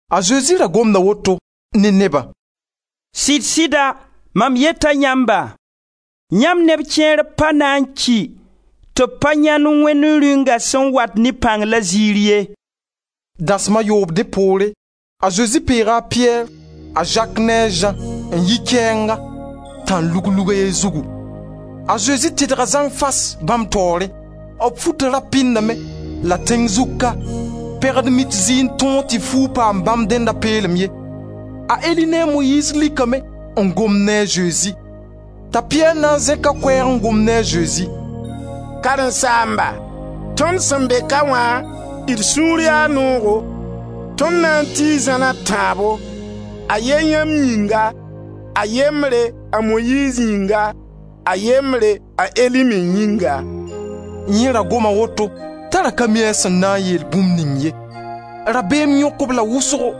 A Zezi ra gomda woto ne nebã: «Sɩd-sɩda mam yeta yãmba, yãmb neb kẽer pa na n ki tɩ b pa yãend Wẽnd Rĩunga sẽn wat ne pãng la ziir ye.» Dasem a yoob dẽ poore, a Zezi peega a Piyɛr, a Zak ne a Zã, n yi kɛɛnga, tãn-lug-lug a ye zugu. A Zezi tedga zãng fas bãmb taoore. B futa ra pɩndame la tẽng zug ka, pɛgd-mit zɩ n tõog tɩ fuug paam bãmb dẽnda peelem ye. A Eli ne a Moyiiz likame n gomd ne a Zezi. T'a Piyɛr na n zẽk a koɛɛg n gom ne a Zezi: «Karen-saamba, tõnd sẽn be ka wã, d sũur yaa noogo. Tõnd na n tii zãn a tãabo: a ye yãmb yĩnga, a yembre, a Moyiiz yĩnga, a yembre, a Eli me yĩnga.» Yẽ ra goma woto t'a ra ka mi a sẽn na n yeel bũmb ning ye. Rabeem yõk-b la wʋsgo.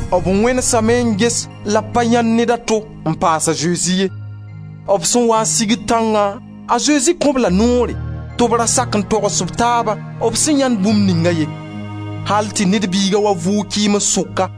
B wẽnesame n ges la b pa le yãend ned a to n paas a Zezi ye. B sẽn waa n sigd tãngã, a Zezi kõ-b la noore tɩ b ra sak n togs b taabã b sẽn yãend bũmb ninga ye, al tɩ Ned Biiga wa vʋʋg kɩɩms sʋka.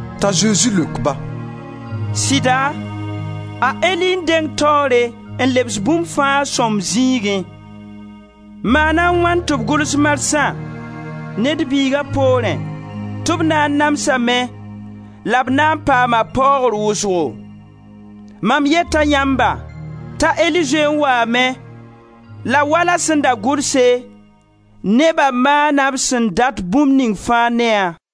T'a Zezi leok-ba: «Sɩda, a Eli n dengd taoore n lebs bũmb fãa a sõmb zĩigẽ. Maana a wãn tɩ b gʋls marsã Ned Biiga poorẽ tɩ b na n namsame la b na n paama paoogr wʋsgo? Mam yeta yãmba t'a Eli zoe n waame, la wala sẽn da gʋlse, neba maana b sẽn dat bũmb ning fãa, ne-a,»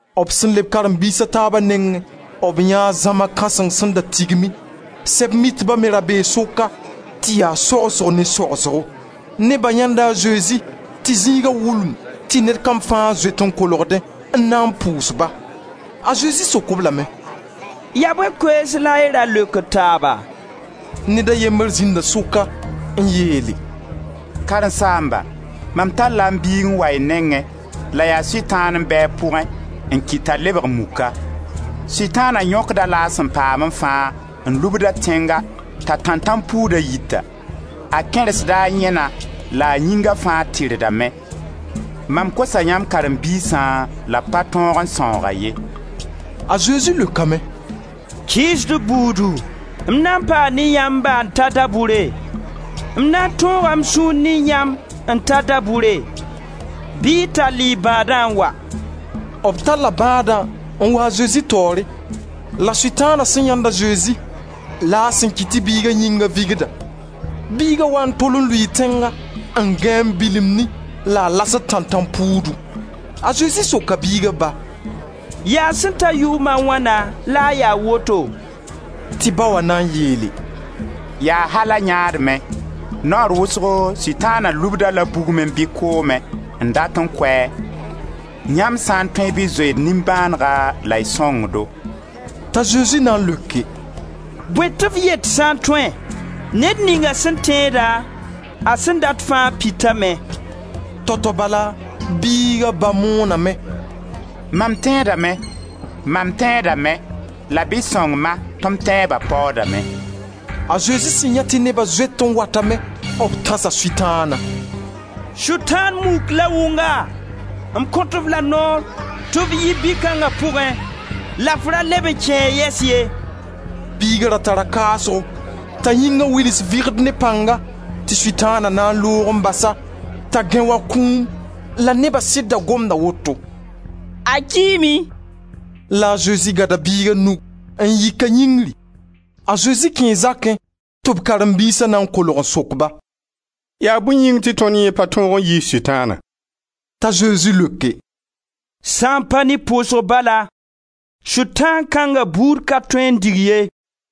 B sẽn leb karen-biis a taaba nengẽ, b yãee zãma kãseng sẽn da tigmi. Sɛb-mitba me ra bee sʋka tɩ ya sogsgo ne sogsgo. Neba yãenda a Zesi tɩ zĩiga wulumd tɩ ned kam fãa zoet n kolgdẽ n na n pʋʋs-ba. A Zezi sok-b lame: «Yaa bõe koees la y ra leokd taaba?» Ned a yembre zĩnda sʋka n yeele: «Karen-saamba, mam talla m biig n wa y nengẽ, la yaa Sʋtãan n be a pʋgẽ n kɩt t'a lebg muka. Sʋtãana yõkd-a-la a sẽn paamẽ fãa, n lubd-a tẽnga, t'a tãntãmpuuda yita. A kẽrsda a yẽna la a yĩnga fãa tirdame. Mam kosa yãmb karen-biisã la b pa tõog n sãoog-a ye.» A Zezi leokame: «Kɩɩsdb buudu, m na n paa ne yãmba n ta da-bʋre? M na n tõoga m sũur ne yãmb, n ta da-bʋre? Bɩ y tall y bãadã n wa!» B talla bãadã n wa a Zezi taoore. La Sutãana sẽn yãend a Zezi la a sẽn kɩt tɩ biiga yĩnga vɩgda. Biiga waa n tol n lʋɩɩ tẽnga, n gãe n bilimdẽ la a lasd tãntãmpuudu. A Zezi soka biiga ba: «Yaa sẽn ta yʋʋm a wãna la a ya woto?» Tɩ ba wã na n yeele: «Yaa al a yãadme. Naoor wʋsgo Sʋtãana lubd-a-la bugmẽ bɩ koomẽ n dat n kʋ-a. Yãmb sã n tõe bɩ y zoe d nimbãanega la y sõng-do.» T'a Zezi na n leoke: «Bõe tɩ f yet: sã n tõe? Ned ninga sẽn tẽeda, a sẽn dat fãa pitame.» Tao-tao bala biiga ba mooname: «Mam tẽedame la bɩ y sõng-ma tɩ m tẽeba paoodame.» A Zezi sẽn yãe tɩ neba zoet n watame b tãsa Sʋtãana: «Sʋtãan muk la wʋnga, m kõt-f la noor tɩ f yi bi-kãnga pʋgẽ la f ra leb n kẽ-a yɛs ye.» Biiga ra tara kaasgo t'a yĩnga wils vɩgd ne pãnga tɩ Sʋtãana na n loog n bas-a t'a gãe wa kũum la neba sɩd da gomda woto: «A kiime!» La a Zezi gãda biiga nug n yik-a yĩngri. A Zezi kẽe zakẽ tɩ b karen-biisa na n kolg n sok-ba: «Yaa bõe yĩng tɩ tõnd yẽ pa tõog n yiis Sʋtãana?» T'a Zezi leoke: «Sã n pa ne pʋʋsg bala, Sʋtãan kãnga buud ka tõe n dig ye.»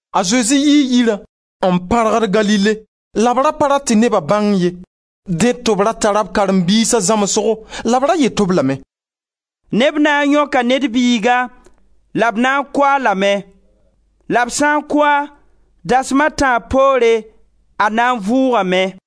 A Zezi yii yirã n pãrgd Galile la b ra pa rat tɩ neba bãng ye. Dẽ tɩ b ra tara b karen-biisa zãmsgo la b ra yet-b lame: «Neb na n yõka Ned Biiga la b na n kʋ-a lame. La b sã n kʋ-a, dasma a tãab poore, a na n vʋʋgame.»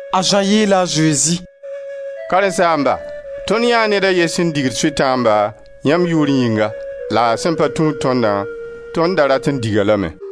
A Zã yeela a Zezi: «Karen-saamba, tõnd yãee ned a ye sẽn digd Sʋtãamba, yãmb yʋʋr yĩnga, la a sẽn pa tũud tõndã, tõnd da rat n dig-a lame.»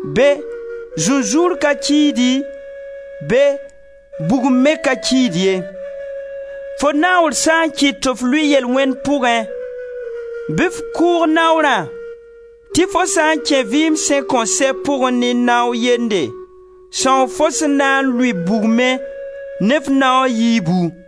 Be zũnzũur ka kiidi, be bugum me ka kiid ye.] Fo naoor sã n kɩt tɩ f lʋɩ yel-wẽnd pʋgẽ bɩ f kʋʋg naoorã, tɩ fo sã n kẽ vɩɩm sẽn kõn sɛ pʋgẽ ne nao yende, sãoo fo sẽn na n lʋɩ bugmẽ ne f naoa yiibu. [